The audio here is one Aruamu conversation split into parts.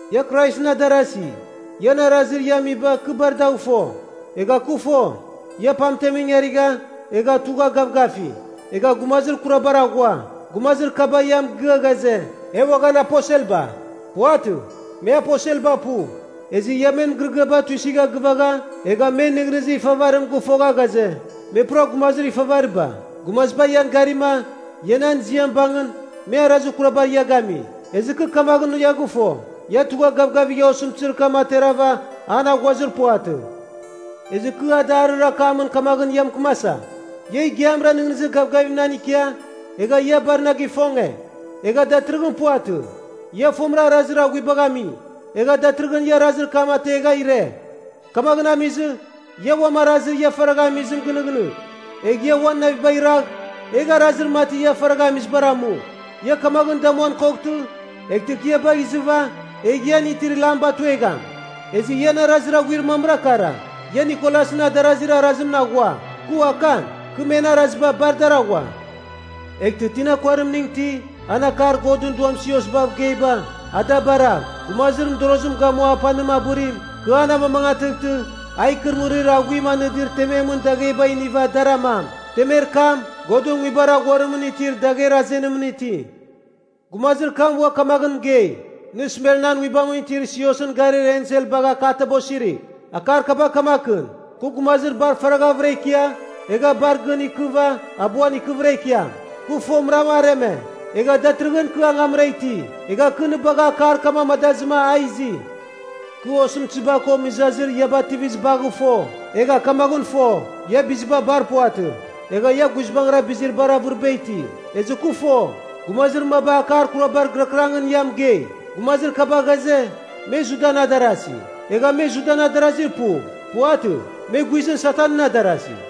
Ia Kraisɨn adarasi, ian arazir ia amiba kɨ bar dagh fo. Egha kɨ fo, ia pamtem ingarigha, egha tugha gavgafi. Egha gumazir kurabar aghua. Gumazir kaba ia mɨgɨa ghaze, “E uaghan aposelba.” Puvatɨ, me aposelba pu. Ezɨ ia men mɨgɨrɨgɨaba tuisigha gɨvagha, egha men nɨghnɨzir ifavarim gɨfogha ghaze, me pura gumazir ifavariba. Gumaziba ian garima, ia nan ziam bangɨn, me arazir kurabar ia gami. Ezɨ kɨ kamaghɨn ia gɨfo, ia tugha gavgavigha osɨmtɨzir kam aterava an aghuazir puvatɨ. Ezɨ kɨ adarir akamɨn kamaghɨn ia mɨkɨmasa, ia igiamra nɨghnɨzir gavgavim nan ikia, egha ia bar na gifonge, egha datɨrɨghɨn puvatɨ. Ia fomɨra arazir aghuibagh ami, egha datɨrɨghɨn ia arazir kam ategha ire. Kamaghɨn amizɨ, ia uam arazir ia faragha amizim gɨnɨghnɨgh, egh ia uan navibagh iragh, egh arazir mati ia faragha amizibar amu. Ia kamaghɨn damuan koghtɨ, eghtɨ kɨ ia bagh izɨva egh ian itir lam batuegham. Ezɨ ian arazir aghuir mamra kara, ia Nikolasɨn adarazir arazibar aghua. Kɨ uakan, kɨ men araziba bar dar aghua. Eghtɨ tina kuarimning iti, an akar Godɨn Duam siosbav geiba, a da baragh. Gumazir mɨdorozim gamua apanim abɨrim, kɨ an amamangatɨghtɨ, a ikɨrɨmɨrir aghuim anɨdir tememɨn dagheba iniva dar amam. Temer kam, Godɨn Nguibar Aghuarimɨn itir dagher azenimɨn iti.’” Gumazir kam ua kamaghɨn mɨgei, “Nɨ Smernan nguibamɨn itir siosɨn garir ensel bagh akataba osirigh. Akar kaba kamakɨn, Kɨ gumazir bar faraghavɨra ikia, egh bar gɨn ikɨva abuan ikɨvɨra ikiam. Kɨ fomɨram areme, egha datɨrɨghɨn kɨ angamra iti. Egha kɨ nɨ bagha akar kam amadazɨma a izi. Kɨ osɨmtɨziba ko mɨzazir ia bativizibagh fo. Egha kamaghɨn fo, ia biziba bar puvatɨ. Egha ia guizbangɨra bizir bar avɨriba iti. Ezɨ kɨ fo, gumazir maba akar kurabar gɨrakɨrangɨn ia mɨgei. Gumazir kaba ghaze, me Judan adarasi. Egha me Judan adarazi pu. Puvatɨ. Me guizɨn Satanɨn adarasi.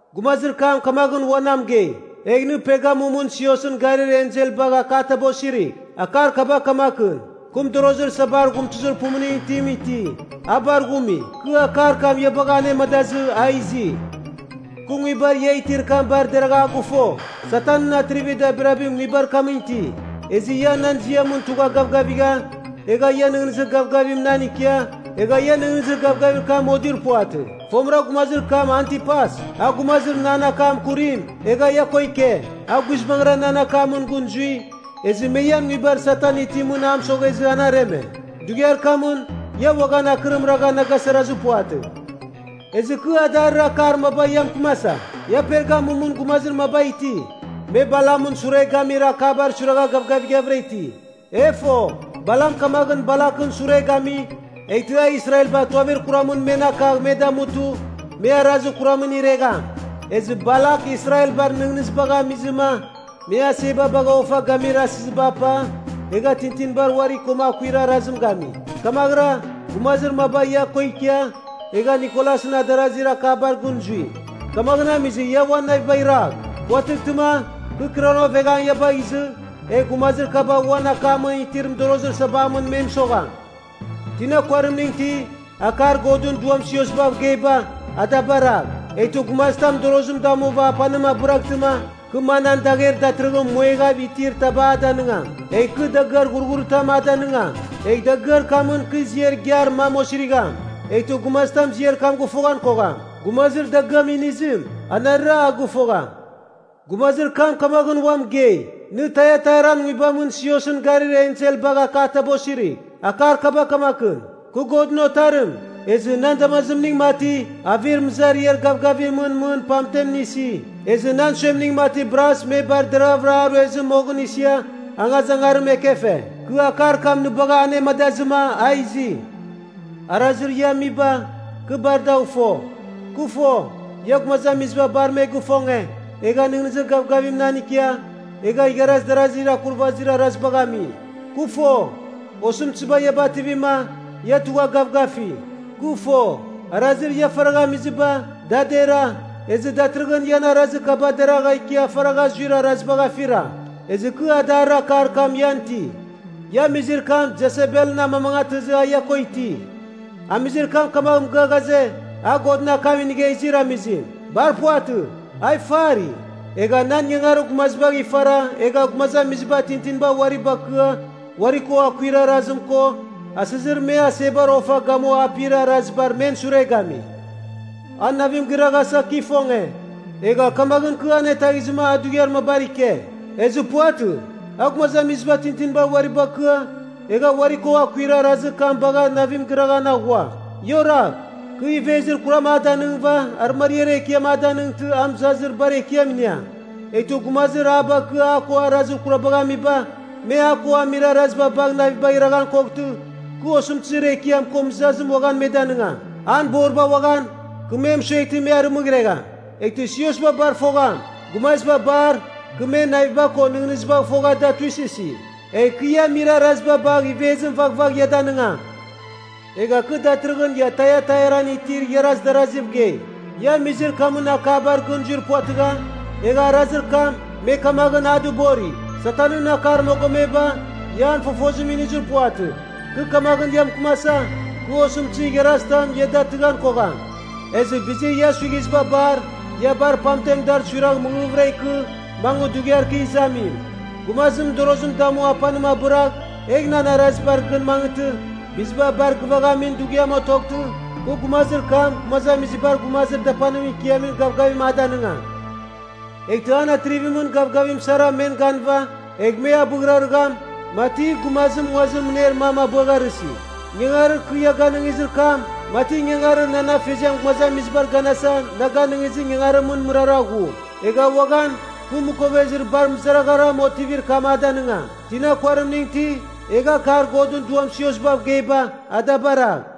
Gumazir kam kamaghɨn ua na mɨgei, “Egh nɨ Pergamumɨn siosɨn garir ensel bagh akataba osirigh. Akar kaba kamakɨn, ‘Kɨ mɨdorozir sabar ghumtɨzir pumuning itim iti, a bar ghumi. Kɨ akar kam ia bagha anemadazɨ a izi. Kɨ nguibar ia itir kam bar deragha a gɨfo, Satanɨn atrivir dabirabim nguibar kamɨn iti. Ezɨ ia nan ziamɨn tugha gavgavigha, egha ia nɨghnɨzir gavgavim nan ikia egha ia nɨghnɨzir gavgavir kam modir puvatɨ. Fomɨra gumazir kam Antipas, a gumazir nan akam kurim, egha ia ko ike. A guizbangɨra nan akamɨn gɨn zui, ezɨ me ian nguibar Satan itimɨn a mɨsoghezɨ an areme. Dughiar kamɨn ia uaghan akɨrim ragha na gasarazir puvatɨ. Ezɨ kɨ adarir akar maba ia mɨkɨmasa. Ia Pergamumɨn gumazir maba iti, me Balamɨn sure gamir akabar suiragha gavgavighavɨra iti. E fo, Balam kamaghɨn Balakɨn sure gami, eghtɨ a Israelba tuavir kuramɨn men akagh me damutɨ, me arazir kuramɨn iregham. Ezɨ Balak Israelbar nɨghnɨzibagh amizɨma, me aseba bagha ofa gamir asɨziba apa, egha tintinibar uari koma akuir arazim gami. Kamaghɨra, gumazir maba ia ko ikia, egha Nikolasɨn adarazir akabar gɨn zui. Kamaghɨn amizɨ ia uan navibagh iragh. Puvatɨghtɨma, kɨ kɨranoveghang ia bagh izɨ, egh gumazir kaba uan akamɨn itir mɨdorozir sabamɨn me mɨsogham. Tina kuarimning iti, akar Godɨn Duam siosbav geiba, a da baragh. Eghtɨ gumazitam mɨdorozim damuva apanim abɨraghtɨma, kɨ manan dagher datɨrɨghɨn muegav itir taba a danɨngam. Egh kɨ dagɨar ghurghuritam a danɨngam. Egh dagɨar kamɨn kɨ ziar igiar mam osirigham, eghtɨ gumazitam ziar kam gɨfoghan kogham. Gumazir dagɨam inizim, anarɨra a gɨfogham.’” Gumazir kam kamaghɨn ua mɨgei, “Nɨ Taiatairan nguibamɨn siosɨn garir ensel a bagh akataba osirigh. Akar kaba kamakɨn, ‘Kɨ Godɨn Otarim, ezɨ nan damazimning mati avir mɨzariar gavgavimɨn mɨn pamten isi, ezɨ nan suemning mati bras me bar deravɨra a ruezɨ moghɨn isia angazangarim ekefe. Kɨ akar kam nɨ bagha anemadazɨma a izi. Arazir ia amiba, kɨ bar dagh fo. Kɨ fo, ia gumazamiziba bar me gifonge, egha nɨghnɨzir gavgavim nan ikia, egha igharaz darazir akurvazir arazibagh ami. Kɨ fo, osɨmtɨziba ia bativima, ia tugha gavgafi. Kɨ fo, arazir ia faragha amiziba, da dera, ezɨ datɨrɨghɨn ian arazir kaba deragha ikia faragha zuir arazibagh afira. Ezɨ kɨ adarir akar kam ian iti. Ia amizir kam Jesebelɨn amamangatɨzɨ a ia ko iti. Amizir kam kamagh mɨgɨa ghaze, a Godɨn akam inigha izir amizim. Bar puvatɨ, a ifari. Egha nan ingangarir gumazibagh ifara egha gumazamiziba tintinibar uari bakɨa uari ko akuir arazim ko asɨzir me asebar ofa gamua apir arazibar men sure gami. A navim gɨraghasa kɨ ifonge, egha kamaghɨn kɨ anetaghizɨma a dughiar mabar ike. Ezɨ puvatɨ, a gumazamiziba tintinibar uari bakɨa, egha uari ko akuir arazir kam bagh navim gɨraghan aghua. Ia oragh. Kɨ ivezir kuram a danɨngɨva arɨmariar ekiam a danɨngtɨ a mɨzazir bar ekiam iniam. Eghtɨ gumazir a bakɨa a ko arazir kurabagh amiba, me a ko amir araziba bagh navibagh iraghan koghtɨ, kɨ osɨmtɨzir ekiam ko mɨzazim uaghan me danɨngam. An boriba uaghan, kɨ me mɨsueghtɨ me arɨmɨghregham. Eghtɨ siosba bar fogham, gumaziba bar kɨ men naviba ko nɨghnɨzibagh fogha da tuisɨsi. Egh kɨ ia amir araziba bagh ivezim vaghvagh ia danɨngam. Egha kɨ datɨrɨghɨn ia Taiatairan itir igharaz daraziv gei. Ia amizir kamɨn akabar gɨn zuir puvatɨgha, egha arazir kam, me kamaghɨn a dɨbori, “Satanɨn akar mogomeba,” ia an fofozim inizir puvatɨ. Kɨ kamaghɨn ia mɨkɨmasa, kɨ osɨmtɨzir igharazitam, ia datɨghan kogham. Ezɨ bizir ia suighiziba bar, ia bar pamten dar suiragh mɨghɨghvɨra ikɨ, mangɨ dughiar kɨ izamim. Gumazim mɨdorozim damu apanim dɨkabɨragh, egh nan arazibar gɨn mangɨtɨ, biziba bar gɨvaghamin dughiam otoghtɨ, kɨ gumazir kam gumazamizibar gumazir dapanimɨn ikiamin gavgavim a danɨngam. Eghtɨ an atrivimɨn gavgavim sara men ganɨva egh me abɨghrarɨgham, mati gumazim nguazir mɨner mam abɨagharɨsi. Ingangarir kɨ a ganɨngizir kam, mati ingangarir nan afeziam gumazamizibar ganasa na ganɨngizir ingangarimɨn mɨrara ghu. Egh uaghan, kɨ mɨkovezir bar mɨzaragharam otivir kam a danɨngam. Tina kuarimning iti, egh akar Godɨn Duam siosbav geiba, a da baragh.’”